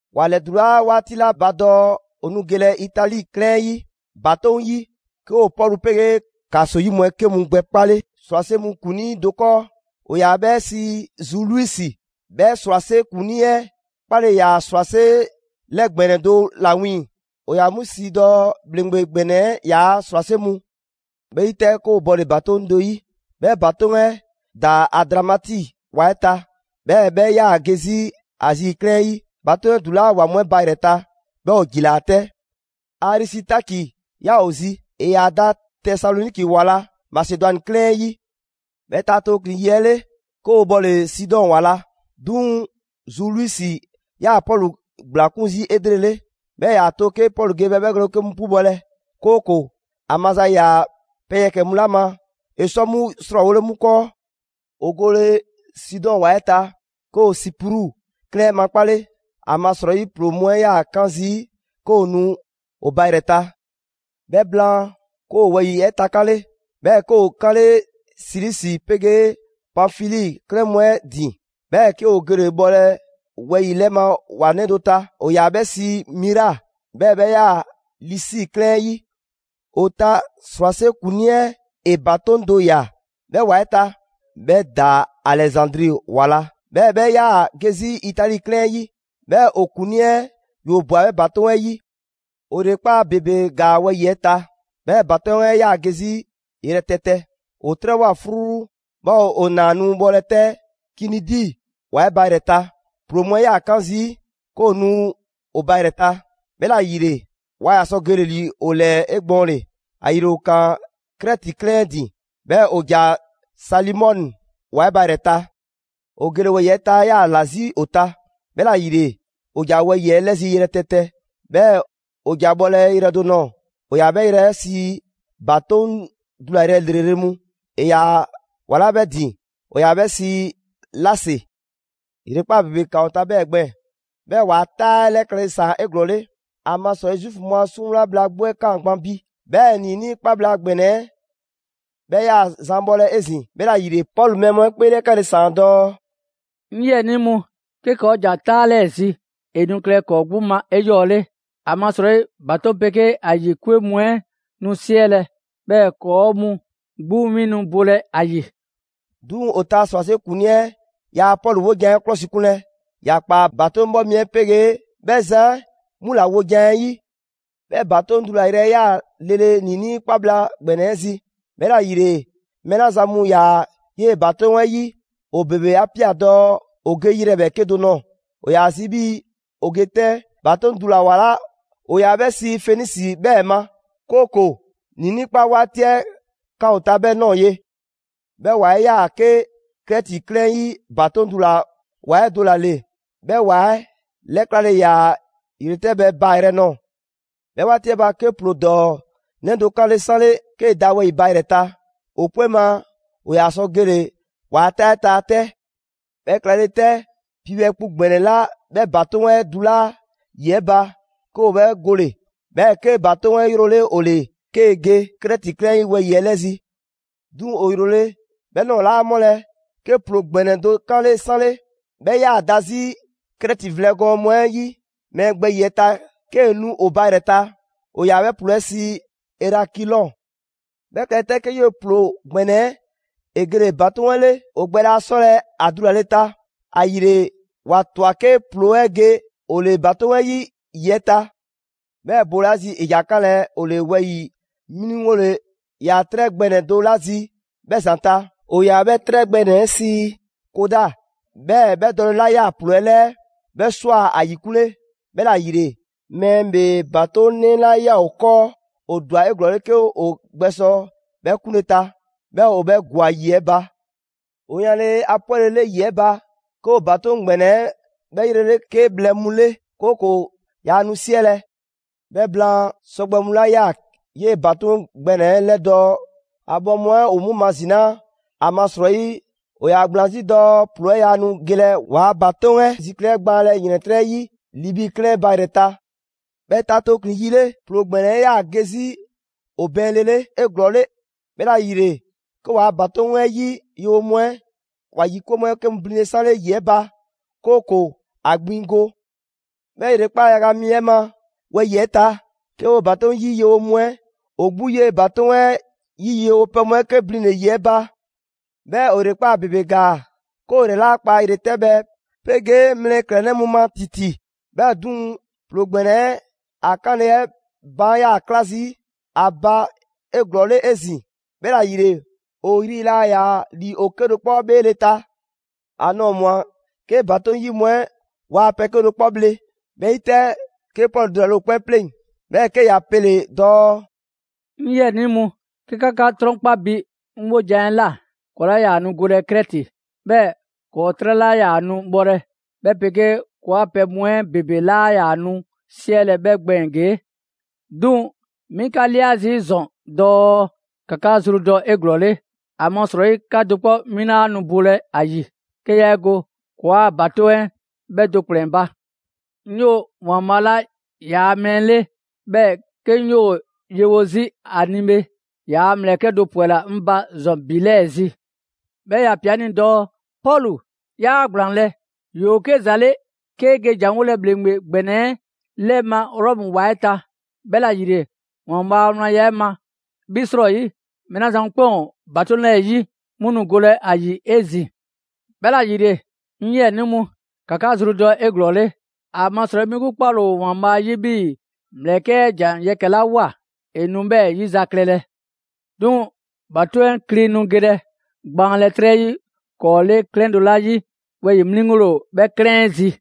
‑Wa ‑lɛdulaa 'waati 'la ba dɔɔ 'o nu gelɛ Itali 'klɛɛn 'ɛ 'yi ‑batoŋ' yi, 'ke ‑o Pɔlu 'pegee ‑kaso 'yi 'mu 'ɛ 'ke mu gbɛkpale ‑srwase' mu ‑kuŋlii do 'kɔɔ: ‑o ‑yaa 'bhɛ sii Zuliusi. 'Bhɛ ‑srwase' ‑kuŋlii 'ɛ 'kpale ‑yaa ‑srwase' 'lɛ ‑gbɛnɛ do 'la 'wiiŋ‑ ‑o ‑yaa 'mu sii dɔɔ: «‑Bhleŋgbe ‑gbɛnɛ 'ɛ ‑yaa' ‑srwase' mu.» 'Bhɛ 'yi 'tɛ, 'ke 'o bɔle‑ ‑batoŋ' do 'yi, 'bhɛ ‑batoŋ' 'ɛ ‑daa Adramiti ‑wa 'ɛ ta, 'bhɛɛ‑ 'bhɛ 'yaa‑ ge 'zi Azi 'klɛɛn 'ɛ 'yi ‑batoŋ' dula‑ ‑wa mu 'ɛ ba ‑yrɛ ta; 'bhɛɛ‑ 'o ‑jilaa 'tɛ. Arisitaki ‑yaa 'o zi, ‑e ‑yaa da Tesaloniki ‑wa la, Masedwani 'klɛɛn 'ɛ 'yi. 'Bhɛ ta tooklin‑ yi 'ɛ 'le, 'ke 'o 'bhɔle Sidɔn ‑wa la. 'Duŋ‑ Zuliusi ‑yaa Pɔlu ‑gblakun' zii' 'elrele, 'bhɛɛ‑ ‑e ‑yaa to 'ke Pɔlu ge 'bhɛ 'bhɛgwlɛn‑ 'ke mu 'pubɔlɛ, 'kooko‑ ‑a maza ‑yaa pɛ yɛkɛ‑ mu 'la ma, ‑e sɔ 'mu ‑srɔɔwole 'mu 'kɔɔ. 'O gole Sidɔn ‑wa 'ɛ ta, 'ke 'o Sipru 'klɛɛn 'ɛ makpale, ‑amasrɔyi ‑ploo mu 'ɛ 'yaa‑ 'kan zii' 'ke ‑o nu 'o ba ‑yrɛ ta. 'Bhɛ blaan, 'ke 'o wɛyi‑ 'ɛ takanle, 'bhɛɛ‑ 'ke 'o 'kanle‑ Silisi 'pegee Panfili 'klɛɛn mu 'ɛ ‑din, 'bhɛɛ‑ 'ke 'o gele‑ bhɔlɛ wɛyi‑ 'lɛ ma ‑wa 'nɛ do ta: ‑o ‑yaa 'bhɛ sii Mira, 'bhɛɛ‑ 'bhɛ 'yaa‑ Lisi 'klɛɛn 'ɛ 'yi. 'O ta ‑srwase' ‑kuŋlii 'ɛ ‑e ‑batoŋ' do ꞊ya 'bhɛ ‑wa 'ɛ ta; 'bhɛ ‑daa Alɛzandri ‑wa la, 'bhɛɛ‑ 'bhɛ 'yaa‑ ge 'zi Itali 'klɛɛn 'ɛ 'yi. 'Bhɛɛ‑ 'o ‑kuŋlii 'ɛ ‑yoo' ꞊bwa 'bhɛ ‑batoŋ' 'ɛ 'yi. 'O ‑yrekpaa' ‑bebe ‑gaa wɛyi‑ 'ɛ ta, 'bhɛɛ‑ ‑batoŋ' 'ɛ 'yaa‑ ge 'zi yrɛtɛtɛ. 'O 'trɛbhwa‑ 'fruu, 'bhɛɛ‑ 'o 'naa nu bhɔlɛ 'tɛ Kinidi ‑wa 'ɛ ba ‑yrɛ ta. ‑Ploo mu 'ɛ 'yaa‑ 'kan zii' 'ke ‑o nu 'o ba ‑yrɛ ta, 'bhɛla‑ ‑yile 'waa ‑yaa sɔ gele‑ ‑li 'o 'lɛɛ 'egbɔɔnle. ‑Ayile 'o ꞊kaan Krɛti 'klɛɛn 'ɛ ‑din, 'bhɛɛ‑ 'o ‑ja Salimone ‑wa 'ɛ ba ‑yrɛ ta. 'O gele wɛyi‑ 'ɛ ta 'ɛ 'yaa‑ ‑la 'zi 'o ta, 'bhɛla‑ ‑yile 'o ‑ja wɛyi‑ 'ɛ 'lɛ zi yrɛtɛtɛ, 'bhɛɛ‑ 'o ‑ja bhɔlɛ yrɛ do nɔɔ‑: ‑o ‑yaa 'bhɛ yrɛ 'ɛ sii: «‑Batoŋ' dulayrɛ ‑lrele' mu». ‑E ‑yaa ‑wa 'la 'bhɛ ‑din ‑o ‑yaa 'bhɛ sii Lase. ‑Yrekpaa' ‑bebe ‑kaan 'o ta 'bhɛɛ‑ gbɛɛn‑. 'Bhɛɛ‑ 'waa‑ 'taa 'ɛ 'lɛ klɛle ‑saan 'eglɔɔle. ‑Amasrɔyi Zuufu mu a 'suŋwla bhla 'gbu 'ɛ 'kaan‑ gban bi, 'bhɛɛ‑ ‑niinii' 'kpa bhla ‑gbɛnɛ 'ɛ 'bhɛ 'yaa‑ zan bhɔlɛ 'ezin‑. 'Bhɛla‑ ‑yile, Pɔlu mɛɛ mu 'ɛ 'kpeelɛkanle ‑saan dɔɔ: «'Ŋ 'yiɛnii mu, 'ke ‑kɔɔ' ‑ja 'taa 'lɛɛ zi, ‑e nu klɛlɛ ‑kɔɔ' 'gbu ma 'eyɔɔle: ‑amasrɔyi ‑batoŋ' 'pegee ‑a ‑yi 'kwe mu 'ɛ nu 'siɛlɛ‑, 'bhɛɛ‑ ‑kɔɔ' mu 'gbu 'win nu bolɛ ‑a ‑yi.» 'Duŋ‑ 'o ta ‑srwase' ‑kuŋlii 'ɛ yaa Pɔlu 'wojan‑ 'ɛ 'klɔsikunlɛ. ‑Ya ꞊kpaa ‑batoŋ' 'bhɔ mi 'ɛ 'pegee 'bhɛ zan 'ɛ 'mu ‑la wojan 'ɛ 'yi. 'Bhɛ ‑batoŋ' dulayrɛ 'ɛ yaa ‑yaa lele ‑niinii' 'kpa bhla ‑gbɛnɛ 'ɛ zi; 'bhɛla‑ ‑yile mɛɛ 'la zan mu ‑yaa 'yee‑ ‑batoŋ' 'ɛ 'yi, ‑o ‑bebe 'a ꞊pia dɔɔ 'o ge yrɛ ‑bhɛɛke' do nɔɔ‑. ‑O 'yaa‑ zi 'bhii‑ ‑o ge 'tɛn ‑batoŋ' dula‑ ‑wa 'la ‑o ‑yaa 'bhɛ sii Fenisi 'bhɛɛ‑ ma, 'kooko‑ ‑niinii' 'kpa 'waati 'ɛ kan 'o ta 'bhɛ ꞊nɔɔ ye. 'Bhɛ ‑wa 'ɛ 'yaa‑ 'ke Krɛti 'klɛɛn 'ɛ 'yi ‑batoŋ' dula‑ ‑wa 'ɛ do ‑la ‑le; 'bhɛ ‑wa 'ɛ 'lɛklale ‑yaa ‑yretɛbhɛ baa‑ yrɛ nɔɔ‑. 'Bhɛ 'waati 'ɛ ba, 'ke ‑ploo ‑dɔɔ 'nɛ do 'kanle‑ 'sanle 'kee‑ da wɛyi‑ ba ‑yrɛ ta. ‑O 'kpee ma ‑o ‑yaa sɔ gele‑ ‑waa' 'taa 'ɛ ta 'tɛ. 'Bhɛ klɛle 'tɛ, piibhɛ kpu ‑gbɛnɛ 'la 'bhɛ ‑batoŋ' 'ɛ dulaa' ‑yi 'ɛ ba, 'ke ‑o 'bhɛ gole‑, 'bhɛɛ‑ 'ke ‑batoŋ' 'ɛ 'yrole 'o 'le, 'kee‑ ge Krɛti 'klɛɛn 'ɛ 'yi wɛyi‑ 'ɛ 'lɛ zi. 'Duŋ‑ 'o 'yrole‑ 'bhɛ ꞊nɔɔ 'laa ‑mɔlɛ', 'ke ‑ploo ‑gbɛnɛ do 'kanle‑ 'sanle: 'bhɛ 'yaa‑ da 'zi Krɛti vlɛ gɔɔn mu 'ɛ 'yi, mɛɛ gbɛ ‑yiɛ' ta 'kee‑ nu 'o ba ‑yrɛ ta, ‑o ‑yaa 'bhɛ ‑ploo 'ɛ sii Erakilɔn. 'Bhɛ klɛle 'tɛ, 'ke 'yee‑ ‑ploo ‑gbɛnɛ 'ɛ gele‑ ‑batoŋ' 'ɛ 'le. 'O gbɛ laa ‑yaa 'sɔle ‑a dulale ta, ‑ayile 'wa ꞊twa 'ke ‑ploo 'ɛ ge 'o 'le ‑batoŋ' 'ɛ 'yi ‑yi 'ɛ ta. 'Bhɛɛ‑ boolazi, ‑e ‑ja 'kanlɛ‑ 'o 'le wɛyi‑ 'mliŋgole ‑yaa 'trɛ gbɛ ‑nɛ do 'la zi 'bhɛ ‑zanta', ‑o ‑yaa 'bhɛ 'trɛ gbɛ ‑nɛ 'ɛ sii Koda, 'bhɛɛ‑ 'bhɛ dɔle 'la ꞊yaa ‑ploo 'ɛ 'lɛɛ, 'bhɛ ꞊swa ‑a ‑yikunle. 'Bhɛla‑ ‑yile, mɛɛ ‑bhee ‑batoŋnɛ 'la ꞊yaa 'o 'kɔɔ, 'o ‑dwa 'eglɔɔle 'ke 'o gbɛsɔ 'bhɛ 'kunle ta, 'bhɛɛ‑ 'o 'bhɛ ‑gwa ‑yi 'ɛ ba. 'O 'yanle‑ ‑a 'pwɛlele ‑yi 'ɛ ba, 'ke 'o ‑batoŋ' ‑gbɛnɛ 'ɛ 'bhɛ 'yrele 'ke bhlɛ mu 'le, 'kooko‑ yaa nu 'siɛlɛ‑. 'Bhɛ blaan, sɔgbɛ mu 'la 'yaa‑ 'yee‑ ‑batoŋ' ‑gbɛnɛ 'ɛ 'lɛdɔɔ‑, ‑a bhɔ mu 'ɛ ‑o 'mu mazinaa ‑amasrɔyi ‑o ‑yaa ‑gblaan 'zi dɔɔ ‑ploo 'ɛ 'yaa nu gelɛ 'waa‑ ‑batoŋ' 'ɛ zikli 'ɛ gbaanlɛ ‑yrɛntrɛ' 'yi Libi 'klɛɛn 'ɛ ba ‑yrɛ ta. 'Bhɛ ta tooklin‑ yi 'le, ‑ploo ‑gbɛnɛ 'ɛ 'yaa‑ ge 'zi 'o bɛɛnlele 'eglɔɔle. 'Bhɛla‑ ‑yile 'ke 'waa‑ ‑batoŋ' 'ɛ 'yi yewo mu 'ɛ ‑wa ‑yi 'kwe mu 'ɛ 'ke mu blinle 'sanle ‑yi 'ɛ ba, 'kooko‑ ‑a gbiŋ go. 'Bhɛ ‑yrekpaa' yaga mi 'ɛ ma wɛyi‑ 'ɛ ta, 'ke 'woo‑ ‑batoŋ' 'yi yewo mu 'ɛ ‑o 'gbu 'yee‑ ‑batoŋ' 'ɛ 'yi yewopɛ mu 'ɛ 'ke blinle‑ ‑yi 'ɛ ba. 'Bhɛɛ‑ 'o ‑yrekpaa' ‑bebe ‑gaa 'ke 'o 'yrɛ 'laa kpa ‑yretɛbhɛ 'pegee mlɛklɛnnɛ mu ma ‑titi, 'bhɛɛ‑ 'duŋ‑ ‑ploo ‑gbɛnɛ 'ɛ ‑a 'kanle‑ 'ɛ baan' 'yaa‑ ꞊kla zii' ‑a ba 'eglɔɔle 'ezin‑. 'Bhɛla‑ ‑yile, 'o 'yri 'laa ‑yaa ‑li 'o 'kedo‑ 'kpɔ 'bheele‑ ta. ‑A nɔɔ‑ ꞊mwa, 'ke ‑batoŋ' 'yi mu 'ɛ waa pɛ 'kedo‑ 'kpɔ bhle. 'Bhɛ 'yi 'tɛ, 'ke Pɔlu dulale' ‑o 'kpɛn 'pleŋ‑, 'bhɛɛ‑ 'ke ‑ya pele‑ dɔɔ: «'Ŋ 'yiɛnii mu, 'ke 'ka 'ka 'trɔnkpa bi 'ŋ 'wojan‑ 'ɛ ꞊la, ‑kɔɔ' 'laa ‑yaa nu golɛ Krɛti. 'Bhɛɛ‑ ‑kɔɔ' 'trɛ 'laa ‑yaa nu bhɔlɛ, 'bhɛ 'pegee ‑kɔɔa' pɛ mu 'ɛ ‑bebe 'laa ‑yaa nu 'siɛlɛ‑ 'bhɛ gbɛɛn‑ ‑gee'. 'Duŋ‑ 'mi 'ka 'lia zii' ‑zɔn dɔɔ ‑ka 'ka zru dɔ 'eglɔɔle; ‑amasrɔyi 'ka do 'kpɔ 'win 'laa nu bolɛ ‑a ‑yi, 'ke yaa 'e go ‑kɔɔa' ‑batoŋ' 'ɛ 'bhɛ do ‑kplɛn ba. 'Ŋ 'yoo‑ ‑Waanbhaa' 'la ‑yaa' mɛɛ 'le, 'bhɛɛ‑ 'ke 'ŋ 'yoo‑ yewo 'zi 'a ni bhe, ‑yaa' ‑mlɛkɛ' do ‑pwɛla 'ŋ ba ‑zɔn ‑bi 'lɛɛ‑ zi. 'Bhɛɛ‑ ‑ya ꞊pia 'ŋ ni dɔɔ: ‹Pɔlu, 'yaa ‑gblaanlɛ'! ‑Yoo 'ke ‑za 'le 'kee‑ ge ‑janwolɛ ‑bhleŋgbe ‑gbɛnɛ 'ɛ 'lɛ ma Rɔmu ‑wa 'ɛ ta; 'bhɛla‑ ‑yile, ‑Waanbhaa' a wlanya 'ɛ ma, 'bhi 'srɔyi, mɛɛ 'la zan mu 'kpɛn ‑o ‑batoŋ' 'lɛɛ‑ 'yi, 'mu nu golɛ ‑a ‑yi 'ezin‑.› 'Bhɛla‑ ‑yile, 'ŋ 'yiɛnii mu, ‑ka 'ka zru dɔ 'eglɔɔle; ‑amasrɔyi 'mi 'gbu 'kpale‑ ‑o ‑Waanbhaa' 'yi 'bhii‑ ‑mlɛkɛ' 'ɛ ‑jan yɛkɛ‑ 'la ꞊woa, ‑e nu 'bhɛɛ 'yi za klɛlɛ. 'Duŋ‑ ‑batoŋ' 'ɛ kli nu gelɛ gbaanlɛ 'trɛ 'yi ‑kɔɔ' 'le 'klɛɛn do 'la 'yi, wɛyi‑ 'mliŋgole ‑o 'bhɛ 'klɛɛn 'ɛ zi.»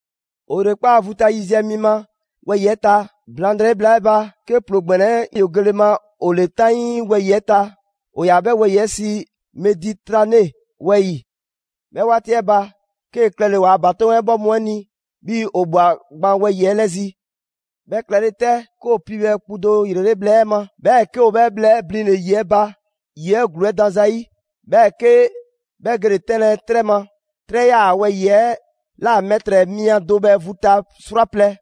'O ‑yrekpaa' vu ta yiziɛ mi ma wɛyi‑ 'ɛ ta, blaŋdrɛyi bhla 'ɛ ba, 'ke ‑ploo ‑gbɛnɛ 'ɛ ‑yoo gele ma 'o 'le 'taŋii wɛyi‑ 'ɛ ta, ‑o ‑yaa' 'bhɛ wɛyi‑ 'ɛ sii ‹Meditrane wɛyi‑›. 'Bhɛ 'waati 'ɛ ba, 'kee‑ klɛle‑ 'waa‑ ‑batoŋ' 'ɛ 'bhɔ mu 'ɛ ni 'bhii‑ 'o ꞊bhwa gban wɛyi‑ 'ɛ 'lɛ zi. 'Bhɛ klɛle 'tɛ, 'ke ‑o piibhɛ kpu do ‑yrele' bhlɛ ma, 'bhɛɛ‑ 'ke ‑o 'bhɛ bhlɛ 'ɛ blinle‑ ‑yi 'ɛ ba, ‑yi 'ɛ ‑gluu 'ɛ dan zayi', 'bhɛɛ‑ 'ke 'bhɛ gele‑ 'tɛnlɛ‑ 'trɛ ma; 'trɛ 'ɛ 'yaa‑ wɛyi‑ 'ɛ ꞊la mɛtrɛ mia do bhɛ vu ta 'srwaplɛ‑.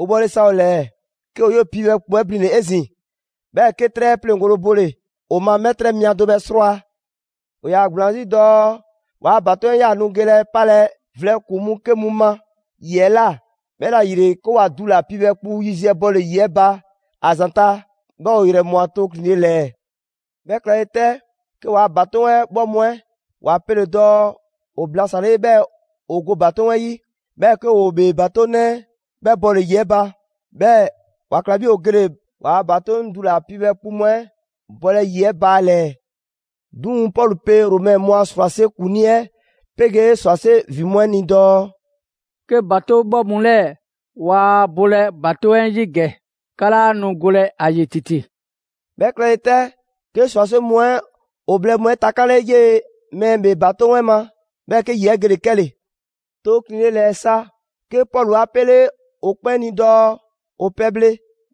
‑O bhɔle sa ‑o ‑lɛɛ, 'ke 'o 'yee‑ piibhɛ kpu 'ɛ blinle‑ 'ezin‑, 'bhɛɛ‑ 'ke 'trɛ 'ɛ pleŋgole bole‑ ‑o ma mɛtrɛ mia do bhɛ 'srwaa‑. ‑O ‑yaa ‑gblaan 'zi dɔɔ 'waa‑ ‑batoŋ' 'ɛ yaa nu gelɛ 'palɛ‑ vlɛ ‑kpuŋ mu 'ke mu ma ‑yi 'ɛ ꞊la, 'bhɛla‑ ‑yile, 'ke ‑wa dula‑ piibhɛ kpu yiziɛ bɔle‑ ‑yi 'ɛ ba ‑a ‑zanta', 'bhɛɛ‑ 'o 'yrɛ ꞊mwa tooklinle ‑lɛɛ. 'Bhɛ klɛle 'tɛ, 'ke 'waa‑ ‑batoŋ' 'ɛ 'bhɔ mu 'ɛ ‑wa pele‑ dɔɔ ‑o blasanle 'bhɛɛ‑ ‑o go ‑batoŋ' 'ɛ 'yi; 'bhɛɛ‑ 'ke 'woo‑ 'o 'bhee ‑batoŋnɛ 'ɛ 'bhɛ bɔle‑ ‑yi 'ɛ ba, 'bhɛɛ‑ ‑wa ‑kla 'bhii‑ ‑o gele‑ 'waa‑ ‑batoŋ' dula‑ piibhɛ kpu mu 'ɛ bɔlɛ ‑yi 'ɛ ba ‑a ‑lɛɛ. 'Duŋ‑ Pɔlu pe Romɛ mu a ‑srwase' ‑kuŋlii 'ɛ 'pegee ‑srwase' ‑vin mu 'ɛ ni dɔɔ: «'Ke ‑batoŋ' 'bhɔ mu 'lɛɛ‑ waa bolɛ ‑batoŋ' 'ɛ 'yi ‑gɛ, 'ka 'laa nu golɛ ‑a ‑yi ‑titi.» 'Bhɛ klɛle 'tɛ, 'ke ‑srwase' mu 'ɛ ‑o bhlɛ mu 'ɛ takanle 'yee‑ mɛɛ ‑bhee ‑batoŋnɛ 'ɛ ma, 'bhɛɛ‑ 'ke ‑yi 'ɛ gele‑ 'kɛle‑. Tooklinle ‑lɛɛ sa, 'ke Pɔlu 'a 'pele ‑o 'kpɛn ni dɔɔ ‑o pɛbhle,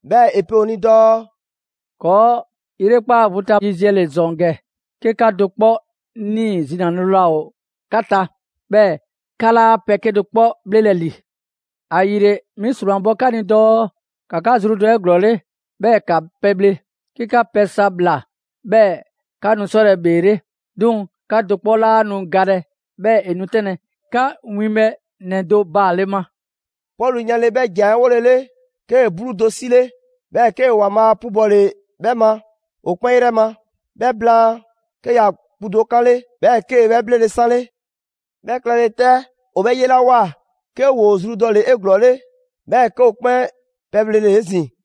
'bhɛɛ‑ ‑e pe ‑o ni dɔɔ: «‑Kɔɔ' 'yrekpaa vu ta yiziɛ ‑le ‑zɔn ‑gɛ 'ke 'ka do 'kpɔ 'nii‑ zinale laa ‑o 'ka ta, 'bhɛɛ‑ 'ka 'laa pɛ 'kedo‑ 'kpɔ 'bhlelɛ‑ ‑li. ‑Ayile 'mi ‑sromabɔ 'ka ni dɔɔ ‑ka 'ka zru dɔ 'eglɔɔle, 'bhɛɛ‑ 'ka pɛbhle; 'ke 'ka pɛ sa ꞊bhla, 'bhɛɛ‑ 'ka nu 'sɔlɛ‑ ‑bheele'. 'Duŋ‑ 'ka do 'kpɔ 'laa nu galɛ 'bhɛɛ‑ ‑e nu 'tɛnlɛ‑ 'ka winbhɛ ‑nɛ do baale ma.» Pɔlu 'yanle‑ 'bhɛ ‑jan 'ɛ 'wolele, 'kee‑ 'bluu do 'sile, 'bhɛɛ‑ 'kee‑ ‑Waanbhaa' 'pubɔle 'bhɛ ma ‑o 'kpɛn 'yrɛ ma; 'bhɛ blaan, 'ke ‑ya kpu do 'kanle 'bhɛɛ‑ 'kee‑ 'bhɛ 'bhlele‑ 'sanle. 'Bhɛ klɛle 'tɛ, ‑o 'bhɛ 'yelawoa, 'ke ‑woo zru dɔle‑ 'eglɔɔle, 'bhɛɛ‑ 'ke ‑o 'kpɛn pɛbhlele 'ezin‑.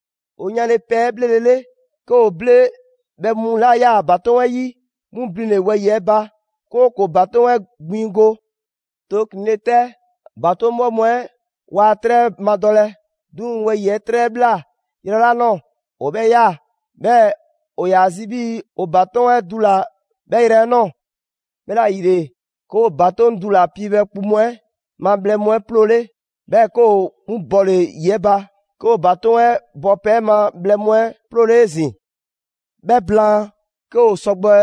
‑O yanle pɛ 'ɛ 'bhlelele, 'ke ‑o ble bhɛ mu 'la 'yaa‑ ‑batoŋ' 'ɛ 'yi 'mu blinle‑ wɛyi‑ 'ɛ ba, 'kooko‑ ‑batoŋ' 'ɛ gbiŋ go. Tooklinle 'tɛ, ‑batoŋ' 'bhɔ mu 'ɛ waa 'trɛ 'ɛ madɔlɛ. 'Duŋ‑ wɛyi‑ 'ɛ 'trɛ 'ɛ ꞊bhla yrɛ 'la ꞊nɔɔ, ‑o 'bhɛɛ‑ ꞊ya, 'bhɛɛ‑ ‑o ‑yaa zi 'bhii‑ ‑o ‑batoŋ' 'ɛ dula‑ 'bhɛ yrɛ 'ɛ ꞊nɔɔ. 'Bhɛla‑ ‑yile, 'ke ‑o ‑batoŋ' dula‑ piibhɛ kpu mu 'ɛ ma bhlɛ mu 'ɛ 'ploole, 'bhɛɛ 'ke ‑o 'mu bɔle‑ ‑yi 'ɛ ba. 'Ke ‑o ‑batoŋ' 'ɛ 'bhɔpɛ‑ 'ɛ ma bhlɛ mu 'ɛ 'ploole 'ezin‑. 'Bhɛ blaan, 'ke ‑o sɔgbɛ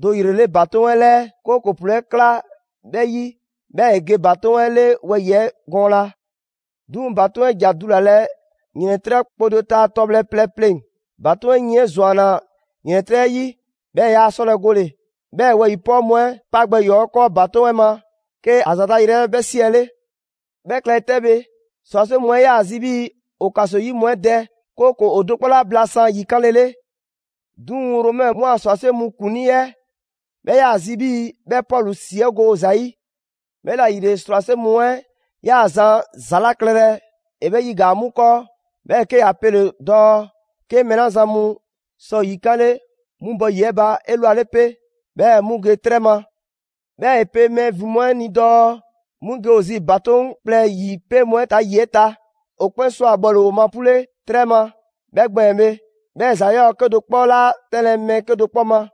do ‑yrele' ‑batoŋ' 'ɛ 'lɛɛ; 'kooko‑ ‑ploo 'ɛ kla 'bhɛ 'yi 'bhɛɛ‑ ‑e ge ‑batoŋ' 'ɛ 'le wɛyi‑ 'ɛ gɔɔna. 'Duŋ‑ ‑batoŋ' 'ɛ ‑ja dulalɛ ‑yrɛntrɛ' kpo do ta tɔbhlɛ plɛ pleŋ‑. ‑Batoŋ' 'ɛ yin 'ɛ ‑zwanna ‑yrɛntrɛ' 'ɛ 'yi, 'bhɛɛ‑ yaa 'sɔlɛ‑ gole. 'Bhɛɛ‑ wɛyi‑ 'pɔɔ mu 'ɛ 'pa gbɛ ‑yɔɔ' 'kɔɔ ‑batoŋ' 'ɛ ma, 'ke ‑a ‑zanta' yrɛ 'ɛ 'bhɛ 'siɛle. 'Bhɛ klɛle 'tɛ bhe, ‑srwase' mu 'ɛ 'yaa‑ zi 'bhii‑ ‑o ‑kaso 'yi mu 'ɛ dɛ, 'kooko‑ ‑o do 'kpɔ 'laa blasan ‑yi 'kanlele. 'Duŋ‑ Romɛ mu a ‑srwase' mu ‑kuŋlii 'ɛ 'bhɛ ‑yaa' zi 'bhii‑ 'bhɛ Pɔlu ‑si 'ɛ go ‑za 'yi. 'Bhɛla‑ ‑yile, ‑srwase' mu 'ɛ 'yaa‑ zan ‑za 'la klɛlɛ, ‑e 'bhɛ 'yigaa‑ 'mu 'kɔɔ, 'bhɛɛ‑ 'ke ‑ya pele‑ dɔɔ 'ke mɛɛ 'la zan mu sɔ ‑yikanle, 'mu bɔ ‑yi 'ɛ ba 'elwale 'pe, 'bhɛɛ‑ 'mu ge 'trɛ ma. 'Bhɛɛ‑ ‑e pe mɛɛ ‑vin mu 'ɛ ni dɔɔ 'mu ge ‑o zi ‑batoŋ' kplɛ 'ɛ ‑yripee' mu 'ɛ ta ‑yi 'ɛ ta. ‑O 'kpɛn ꞊swa bhɔle‑ ‑o ma 'pule 'trɛ ma 'bhɛɛ‑ gbɛɛn‑ bhe, 'bhɛɛ ‑za 'yɔɔ‑ 'kedo‑ 'kpɔ 'laa 'tɛnlɛ‑ mɛɛ 'kedo‑ ma.